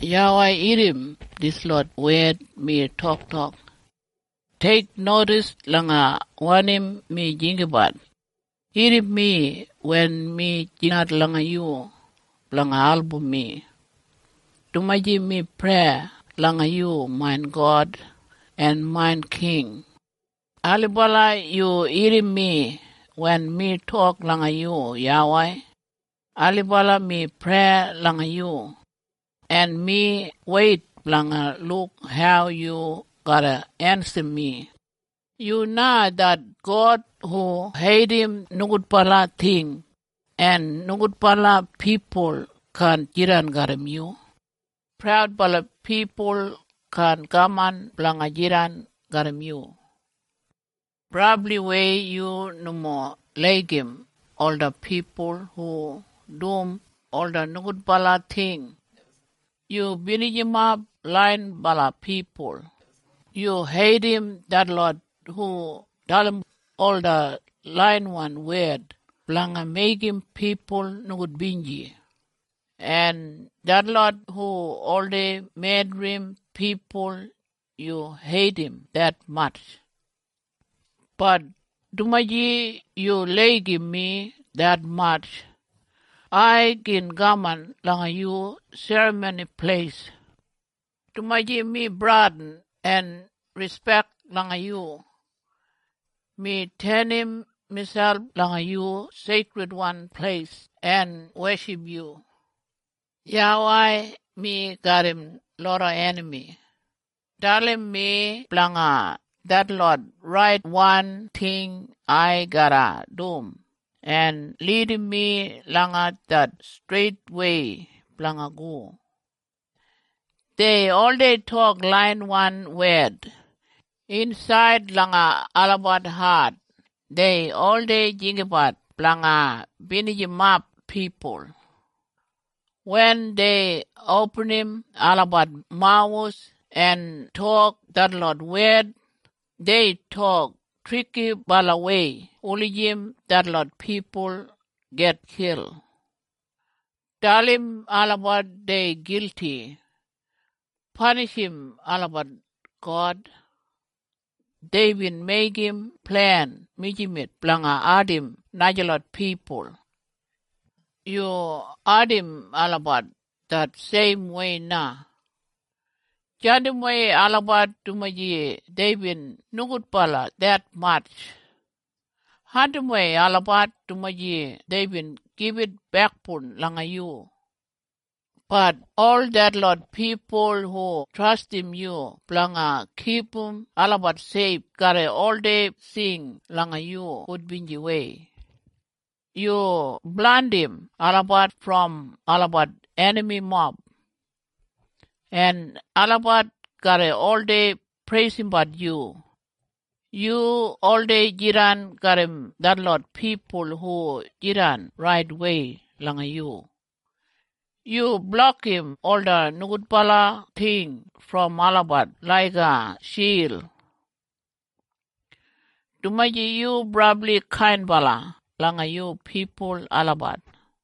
YAWEI irrim dislot wed mi toktok. Teiknodis langa wanim mi jinggabat. Irrim mi wen mi jingat langa yu blanga album mi, dumaji mi prei langa yu main God en main king. Ailibala yu irrim mi wen mi tok langa yu, YAWEI. Ailibala mi prei langa yu, en mi weit blanga luk hau yu garra ensim mi. Yu na det God hu heidim nogudbala ting, en nogudbala pipul kaan jidan garram yu. Praudbala pipul kaan kaman blanga jidan garram yu. Brabliwei yu nomo laigim ola pipul hu dum ola nogudbala ting. Yu binijimap laiyinbala pipul. Yu heidim detlot hu dalim ola laiyawan wed blanga meigim pipul nogudbinji, en detlot hu oldei medrim pipul, yu heidim detmatj. Bat dumaji yu laigim mi detmatj, ai gin kaman langa yu Serramoni Pleis. Dumaji mi bradin en rispek langa yu, mi tenim miselp langa yu Seikridwan Pleis en weship yu. YAWEI, mi garram loda enami. Dalim mi blanga detlot raitwan ting ai garra dum, en lidim mi langa det streitwei blanga go. Dei oldei tok laiyawan wed. Insaid langa olabat hat dei oldei jinggabat blanga binijimap pipul. Wen dei opinim olabat mawus en tok detlot wed, dei tok trikibalawei wulijim detlot pipul gitkil. Dalim olabat dei gilti. Panishim olabat, God. Deibin meigim plen mijamet blanga ardim najalot pipul. Yu ardim olabat det seimwei na. Jandimwei olabat dumaji deibin nogudbala detmatj. Andimwei olabat dumaji deibin gibit bekboun langa yu. Bat ol detlot pipul hu trastim yu blanga kipum olabat seif garra oldei sing langa yu gudbinjiwei. Yu blandim olabat brom olabat enamimob, en olabat garra oldei preisimbat yu. Yu oldei jidan garram detlot pipul hu jidan raitwei langa yu. Yu blokim ola nogudbala ting brom olabat laiga shild, dumaji yu brabli kainbala langa yu pipul olabat.